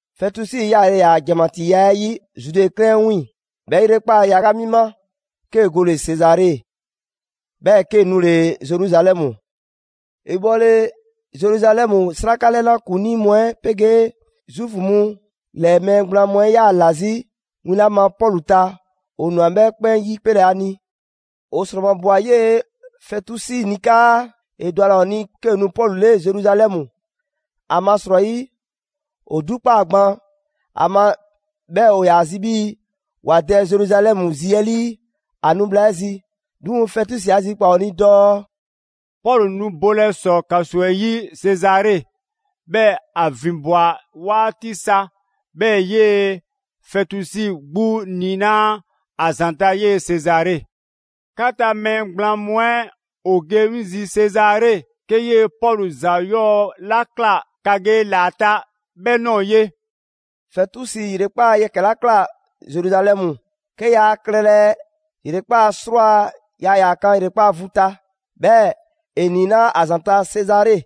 Fɛtusi yaale ‑yaa' ‑janmatiiya 'ɛ 'yi Zude 'klɛɛn 'ɛ 'wiiŋ‑ 'bhɛ ‑yrekpaa' yaga mi ma, 'kee‑ gole‑ Sezare, 'bhɛɛ‑ 'kee‑ nule‑ Zeruzalɛmu. ‑E bhɔle Zeruzalɛmu, 'sraka 'lɛna ‑kuŋlii mu 'ɛ 'pegee Zuufu mu ‑lɛɛ mɛɛ gblaan mu 'ɛ ꞊yaa ‑la 'zi win 'la ma Pɔlu ta; ‑o ꞊nwa 'bhɛ 'kpɛn 'yipelɛ ‑a ni. ‑O ‑sromabwa 'yee‑ Fɛtusi ni 'kaa ‑e ‑dwa ‑a ‑la ‑o ni 'kee‑ nu Pɔlu 'le Zeruzalɛmu; ‑amasrɔyi ‑o 'dukpaa‑ gban ‑a ma 'bhɛɛ‑ ‑o ‑yaa zi 'bhii‑ ‑wa dɛ Zeruzalɛmu zi 'ɛ 'lii ‑a nu bhla 'ɛ zi. 'Duŋ‑ Fɛtusi 'a zikpaa‑ ‑o ni dɔɔ: «Pɔlu nu bolɛ ‑sɔ ‑kaso 'ɛ 'yi Sezare, 'bhɛɛ‑ ‑a ‑vinbwa 'waati sa, 'bhɛɛ‑ 'yee‑ Fɛtusi 'gbu niinaa' ‑a ‑zanta' ye Sezare. 'Ka ta mɛɛ gblaan mu 'ɛ ‑o ge 'ŋ zi Sezare, 'ke 'yee‑ Pɔlu ‑za 'yɔɔ‑ 'la ꞊kla ‑ka ge ‑la ‑a ta 'bhɛ ꞊nɔɔ ye.» Fɛtusi ‑yrekpaa' yɛkɛ‑ 'la ꞊kla Zeruzalɛmu, 'ke ‑yaa klɛlɛ ‑yrekpaa' 'srwaa‑, yaa ‑yaa kan ‑yrekpaa' vu ta, 'bhɛɛ‑ ‑e ‑niinaa' 'a ‑zanta' Sezare.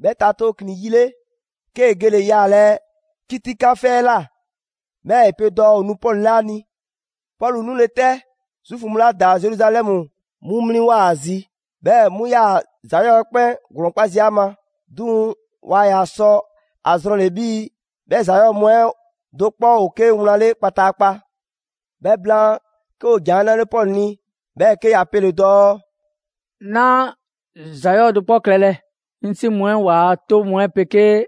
'Bhɛ ta tooklin‑ yi 'le, 'kee‑ gele‑ yaalɛ 'kitikan 'fɛ 'ɛ ꞊la, 'bhɛɛ‑ ‑e pe dɔɔ ‑o nu Pɔlu 'le 'a ni. Pɔlu 'nule‑ 'tɛ, Zuufu mu 'la ‑daa Zeruzalɛmu 'mu 'mliŋwoa‑ ‑a zi, 'bhɛɛ‑ 'mu 'yaa‑ ‑za 'yɔɔ‑ 'ɛ 'kpɛn ‑glɔɔn 'kpa zii' ‑a ma. 'Duŋ‑ waa ‑yaa sɔ a zrɔnle‑ 'bhii‑ 'bhɛ ‑za 'yɔɔ‑ mu 'ɛ do 'kpɔ ‑o 'ke wlan 'le kpataakpa. 'Bhɛ blaan, 'ke ‑o ‑jan 'ɛ 'nale Pɔlu ni, 'bhɛɛ‑ 'ke ‑ya pele‑ dɔɔ: «'Naa ‑za 'yɔɔ‑ do 'kpɔ klɛlɛ, 'ŋ 'si mu 'ɛ ‑waa' 'toŋ mu 'ɛ 'pegee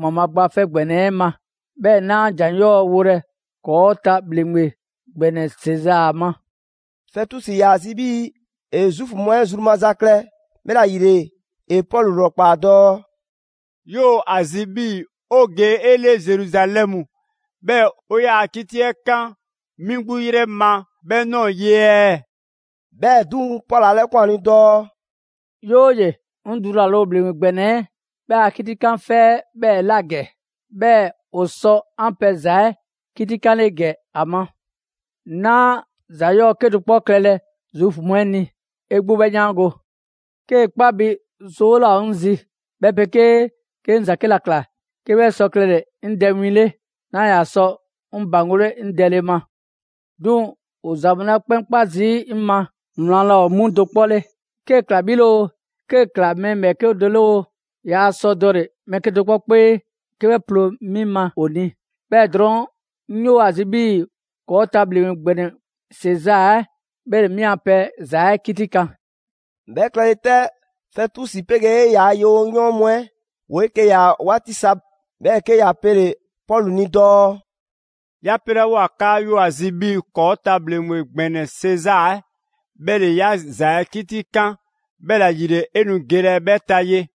‑Waanbhaa' Gba 'Fɛ ‑Gbɛnɛ 'ɛ ma, 'bhɛɛ‑ 'naa ‑jan 'yɔɔ‑ wolɛ ‑kɔɔ' ta ‑bhleŋgbe ‑gbɛnɛ Sezaa ma.» Fɛtusi ‑yaa zi 'bhii‑ ‑e Zuufu mu 'ɛ zru maza klɛ, 'bhɛla‑ ‑yile ‑e Pɔlu 'lrɔkpaa‑ dɔɔ: «'Yoo‑ ‑a zi 'bhii‑ 'o ge 'e 'le Zeruzalɛmu, 'bhɛɛ‑ ‑o 'yaa‑ 'kiti 'ɛ kan 'mi 'gbu 'yrɛ ma 'bhɛ ꞊nɔɔ ye ɛɛ?» 'Bhɛɛ‑ 'duŋ‑, Pɔlu 'a 'lɛkwan‑ ‑a ni dɔɔ: «'Yooye‑, 'ŋ dulale ‑o ‑bhleŋgbe ‑gbɛnɛ 'ɛ 'bhɛ a 'kitikan 'fɛ 'ɛ 'bhɛɛ‑ ꞊la ‑gɛ; 'bhɛɛ‑ ‑o sɔ 'an pɛ ‑za 'ɛ 'kitikanle ‑gɛ ‑a ma. 'Naa ‑za 'yɔɔ‑ 'kedo‑ 'kpɔ klɛlɛ Zuufu mu 'ɛ ni; 'e 'gbu 'bhɛ 'yaango‑. 'Kee‑ 'kpa bi 'zoo 'laa ‑o 'ŋ zi, 'bhɛ 'pegee 'ke 'ŋ ‑za 'ke ‑la ꞊kla 'ke 'bhɛ sɔ klɛle‑ 'ŋ dɛ win 'le, 'naa ‑yaa sɔ 'ŋ ‑baŋgole 'ŋ dɛle ma. 'Duŋ‑ ‑o ‑za mu 'la 'kpɛn 'kpa zii' 'ŋ ma wlan laa 'mu do 'kpɔ 'le, 'kee‑ ꞊kla 'bhi 'le oo, 'kee‑ ꞊kla mɛɛ ‑bhɛɛke' do 'le oo, yaa sɔ dɔle‑ mɛɛ 'kedo‑ 'kpɔ 'kpee 'ke 'bhɛ ploo 'mi ma ‑o ni. 'Bhɛɛ‑ drɔɔn' 'ŋ 'yoo‑ ‑a zi 'bhii‑ ‑kɔɔ' ta ‑bhleŋgbe ‑gbɛnɛ Sezaa 'ɛ 'bhɛ ‑le 'mi a pɛ ‑za 'ɛ 'kitikan.» 'Bhɛ klɛle 'tɛ, Fɛtusi 'pegee ‑yaa' yewoyɔɔn mu 'ɛ ‑woo 'eke‑ ꞊ya 'waati sa, 'bhɛɛ‑ 'ke ‑ya pele‑ Pɔlu ni dɔɔ: «'Ya 'pelawoa 'kaa 'yoo‑ ‑a zi 'bhii‑ ‑kɔɔ' ta ‑bhleŋgbe ‑gbɛnɛ Sezaa 'ɛ 'bhɛ ‑le 'yaa ‑za 'ɛ 'kitikan, 'bhɛla‑ ‑yile 'e nu gelɛ 'bhɛ ta ye.»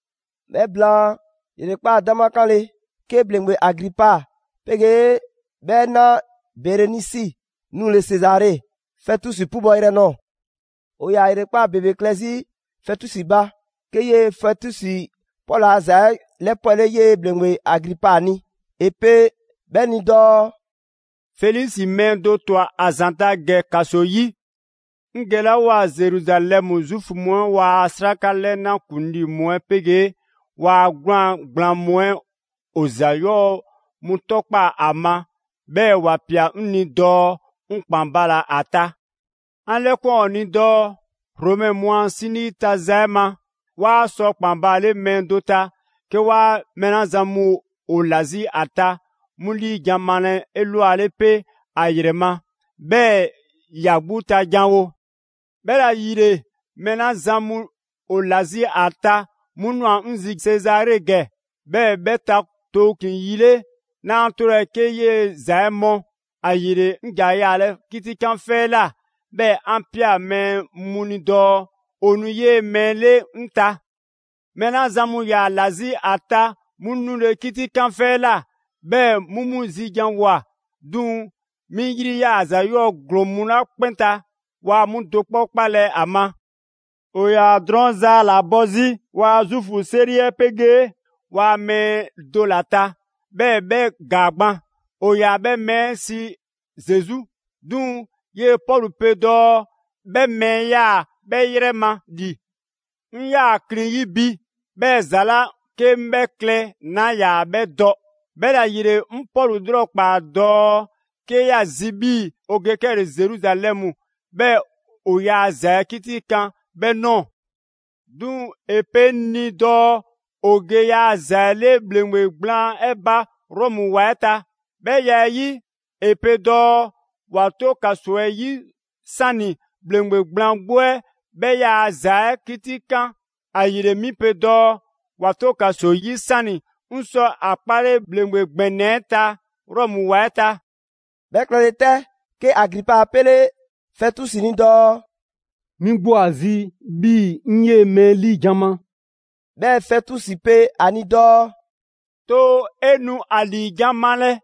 'Bhɛ blaan ‑yrekpaa' 'dama 'kanle‑, 'ke ‑bhleŋgbe Agripa 'pegee 'bhɛ 'na Berenisi 'nule Sezare, Fɛtusi 'pubɔ‑ yrɛ nɔɔ‑. ‑O ‑yaa ‑yrekpaa' ‑bebe klɛ 'zi Fɛtusi ba, 'ke 'yee‑ Fɛtusi Pɔlu ‑a ‑za 'ɛ 'lɛpwɛle 'yee‑ ‑bhleŋgbe Agripa ni. ‑E pe 'bhɛ ni dɔɔ: «Felisi mɛɛ do ꞊twa ‑a ‑zanta' ‑gɛ ‑kaso 'yi. 'Ŋ gelawoa Zeruzalɛmu, Zuufu mu 'ɛ ‑waa' 'sraka 'lɛna ‑kuŋlii mu 'ɛ 'pegee ‑waa' 'gwlaan‑ gblaan mu 'ɛ ‑o ‑za 'yɔɔ‑ mu 'tɔkpaa‑ ‑a ma, 'bhɛɛ‑ ‑wa ꞊pia 'ŋ ni dɔɔ 'ŋ ‑kpan bala‑ ‑a ta. 'An 'lɛkwan‑ ‑o ni dɔɔ: Romɛ mu a 'sinii ta za 'ɛ ma, 'waa sɔ ‑kpan baale mɛɛ do ta, 'ke waa mɛɛ 'la zan mu ‑o ‑la 'zi ‑a ta 'mu 'liijan‑ malɛ 'elwale 'pe ‑a ‑yrɛ ma, 'bhɛɛ‑ ‑ya 'gbu ta janwo. 'Bhɛla‑ ‑yile, mɛɛ 'la zan mu ‑o ‑la 'zi ‑a ta 'mu ꞊nwa 'ŋ zi Sezare ‑gɛ, 'bhɛɛ‑ 'bhɛ ta tooklin‑ yi 'ɛ 'le, 'naa 'tolɛ‑ 'ke 'yee‑ ‑za 'ɛ mɔ. ‑Ayile 'ŋ ‑ja yaalɛ 'kitikan 'fɛ 'ɛ ꞊la 'bhɛɛ‑ 'an ꞊pia mɛɛ mu ni dɔɔ ‑o nu 'yee‑ mɛɛ 'ɛ 'le 'ŋ ta. Mɛɛ 'la zan mu ‑yaa ‑la 'zi ‑a ta 'mu 'nule‑ 'kitikan 'fɛ 'ɛ ꞊la, 'bhɛɛ‑ 'mu 'mu zi ‑janwoa; 'duŋ‑ 'mi 'yri ꞊yaa ‑za 'yɔɔ‑ ‑glɔɔn mu 'la 'kpɛn ta, waa 'mu do 'kpɔ 'kpalɛ‑ ‑a ma. ‑O ‑yaa drɔɔn' zaa ‑la bɔ 'zi ‑waa' Zuufu 'seri 'ɛ 'pegee ‑waa' mɛɛ do ‑la ta, 'bhɛɛ‑ 'bhɛ ‑gaa gban. ‑O ‑yaa 'bhɛ mɛɛ 'ɛ sii Zesu. 'Duŋ‑ 'yee‑ Pɔlu pe dɔɔ 'bhɛ mɛɛ 'ɛ 'yaa‑ 'bhɛ 'yrɛ ma ‑li. 'Ŋ 'yaa‑ klin 'yi bi, 'bhɛɛ‑ ‑za 'la 'ke 'ŋ 'bhɛ klɛ, 'naa ‑yaa 'bhɛ dɔ. 'Bhɛla‑ ‑yile 'ŋ Pɔlu 'lrɔkpaa‑ dɔɔ 'ke ‑ya zi 'bhii‑ 'o ge 'kɛle‑ Zeruzalɛmu 'bhɛɛ‑ 'o ‑yaa ‑za 'ɛ 'kitikan 'bhɛ ꞊nɔɔ. 'Duŋ‑ ‑e pe 'ŋ ni dɔɔ ‑o ge ‑yaa' ‑za 'ɛ 'le ‑bhleŋgbe gblaan 'ɛ ba Rɔmu ‑wa 'ɛ ta: 'bhɛ ya 'ɛ 'yi, ‑e pe dɔɔ ‑wa 'to ‑kaso 'ɛ 'yi 'sani‑ ‑bhleŋgbe gblaan 'gbu 'ɛ 'bhɛ yaa ‑za 'ɛ 'kitikan. ‑Ayile 'mi pe dɔɔ ‑wa 'to ‑kaso 'yi 'sani‑ 'ŋ sɔ ‑a 'kpale ‑bhleŋgbe ‑gbɛnɛ 'ɛ ta Rɔmu ‑wa 'ɛ ta.» 'Bhɛ klɛle 'tɛ, 'ke Agripa 'a 'pele Fɛtusi ni dɔɔ: «'Mi 'gbu ‑o ‑a zi 'bhii‑ 'ŋ 'yee‑ mɛɛ 'ɛ 'liijan‑ ma.» 'Bhɛɛ‑ Fɛtusi pe ‑a ni dɔɔ: «Too 'e nu ‑a ‑liijan' malɛ.»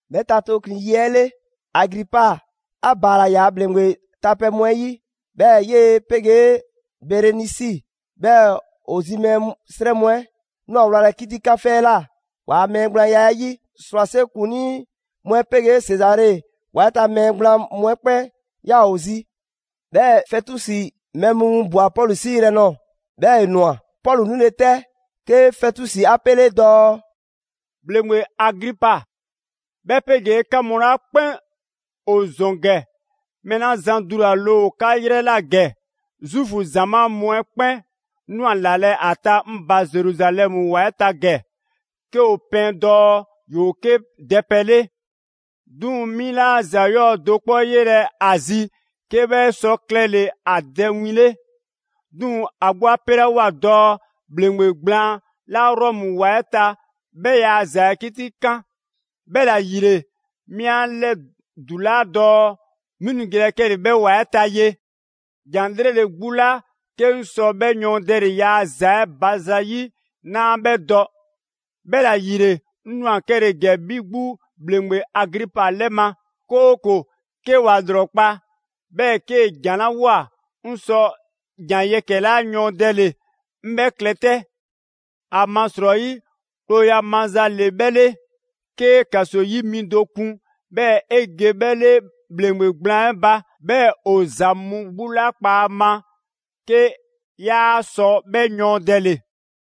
'Bhɛ ta tooklin‑ yi 'ɛ 'le, Agripa 'a ‑baala ‑yaa' ‑bhleŋgbe tapɛ mu 'ɛ 'yi, 'bhɛɛ‑ 'yee‑ 'pegee Berenisi, 'bhɛɛ‑ ‑o zi mɛɛ 'srɛ mu 'ɛ ꞊nwa wlalɛ 'kitikan 'fɛ 'ɛ ꞊la ‑waa' mɛɛ gblaanya 'ɛ 'yi. ‑Srwase' ‑kuŋlii mu 'ɛ 'pegee Sezare ‑wa 'ɛ ta mɛɛ gblaan mu 'ɛ 'kpɛn 'yaa‑ ‑o zi. 'Bhɛɛ‑ Fɛtusi mɛɛ mu winbwa‑ Pɔlu 'sii yrɛ nɔɔ‑, 'bhɛɛ‑ ‑e ꞊nwa. Pɔlu 'nule‑ 'tɛ, 'ke Fɛtusi 'a 'pele dɔɔ: «‑Bhleŋgbe Agripa, 'bhɛ 'pegee 'ka mu 'la 'kpɛn ‑o ‑zɔn ‑gɛ, mɛɛ 'la zan dulale ‑o 'ka 'yrɛ ꞊la ‑gɛ, Zuufu ‑zamaa' mu 'ɛ 'kpɛn ꞊nwa ‑lalɛ' ‑a ta 'ŋ ba Zeruzalɛmu ‑wa 'ɛ ta ‑gɛ; 'ke ‑o pɛɛn dɔɔ ‑yoo 'ke dɛpɛ 'le. 'Duŋ‑ 'mi 'laa ‑za 'yɔɔ‑ do 'kpɔ 'yelɛ‑ ‑a zi 'ke 'bhɛ sɔ klɛle‑ ‑a dɛ win 'le. 'Duŋ‑ ‑a 'gbu 'a 'pelawoa dɔɔ ‑bhleŋgbe gblaan 'la Rɔmu ‑wa 'ɛ ta 'bhɛ ‑yaa' ‑za 'ɛ 'kitikan. 'Bhɛla‑ ‑yile, 'mi 'an 'lɛdulaa dɔɔ 'ŋ nu gelɛ 'kɛle‑ 'bhɛ ‑wa 'ɛ ta ye.» ‑Jan 'lrele‑ 'gbu 'la 'ke 'ŋ sɔ 'bhɛ yɔɔndɛle‑ ‑yaa ‑za 'ɛ ba zayi' 'naa 'bhɛ dɔ; 'bhɛla‑ ‑yile, 'ŋ ꞊nwa 'kɛle‑ ‑gɛ 'bhi 'gbu ‑bhleŋgbe Agripa 'lɛ ma; 'kooko‑ 'ke 'wa 'lrɔkpaa‑, 'bhɛɛ‑ 'kee‑ ‑jan 'la 'woa‑, 'ŋ sɔ ‑jan yɛkɛ‑ 'la yɔɔndɛle, 'ŋ 'bhɛɛ‑ klɛ 'tɛ. ‑Amasrɔyi klooya maza 'le 'bhɛ 'le, 'kee ‑kaso 'yi mi do kun, 'bhɛɛ‑ 'e ge 'bhɛ 'le ‑bhleŋgbe gblaan 'ɛ ba, 'bhɛɛ‑ ‑o ‑za mu 'gbu 'la ꞊kpaa ‑a ma 'ke 'yaa sɔ 'bhɛ yɔɔndɛle.